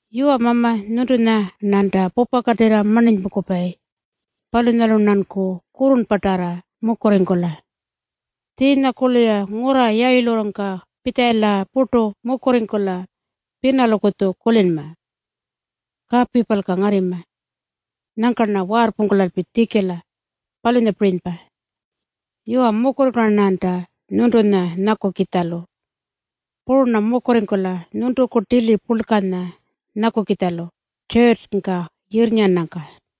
Yuwa Mama, nyuntunya-rnanta pupakatirra marninypungkupayi. Palunyalu-rnanku kurrurnpatarra mukurringkula. Tjiinyakurlu-ya ngurra yayilurrungka pitjalayila purtu mukurringkula pinalukutju kulinma, “Kapipalka ngarrima. Nyangka-rna waarrpungkulalpi tjikila.” Palunyapirinypa. Yuwa, mukurringkula-rnanta nyuntunya nyakukitjalu. Puru-rna mukurringkula nyuntuku tili purlkanya nyakukitjalu tjurrtjungka yirrnyaranyangka.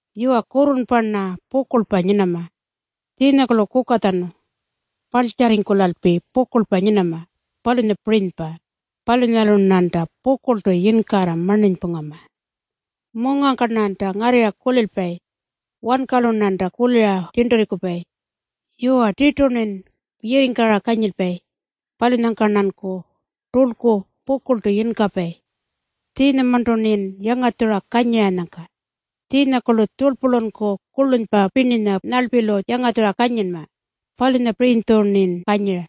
Yuwa, kurrurnpa-rna pukurlpa nyinama. Tjiinyakurlu kukatjanu parltjarringkulalpi pukurlpa nyinama, palunyapirinypa. Palunyalu-rnanta pukurltu yinkarra marninypungama. Mungangka-rnanta ngarrirra kulilpayi. Wankalu-rnanta kulira tjirnturringkupayi. Yuwa, tirtu-rnin yirringkara kanyilpayi. Palunyangka-rnanku turlku pukurltu yinkapayi, tjiinyamarntu-rnin yangatjura kanyiranyangka. Tjiinyakurlu tjurlpulunku kurlunypa pirninya nyarlpilu yangatjura kanyinma. Palunyapirinytju-rnin kanyira.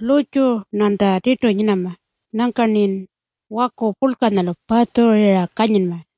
Lurrtju-rnanta tirtu nyinama. Nyangka-rnin waku purlkanyalu patjurira kanyinma.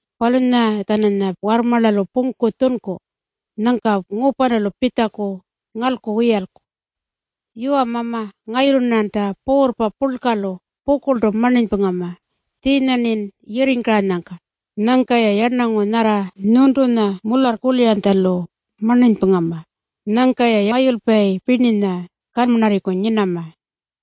palunyanya-tjananya warrmarlalu pungku tjunku. Nyangka ngupanulu pitjaku ngalku wiyalku. Yuwa Mama, ngayulu-rnanta puurrpa purlkalu pukurltu marninypungama, tjiinya-rnin yirringkaranyangka. Nyangkanta-ya yarnangu nyarra nyuntunya mularrkuliranytjalu marninypungama. Nyangka-ya mayulpayi pirninya kanmarrarriku nyinama.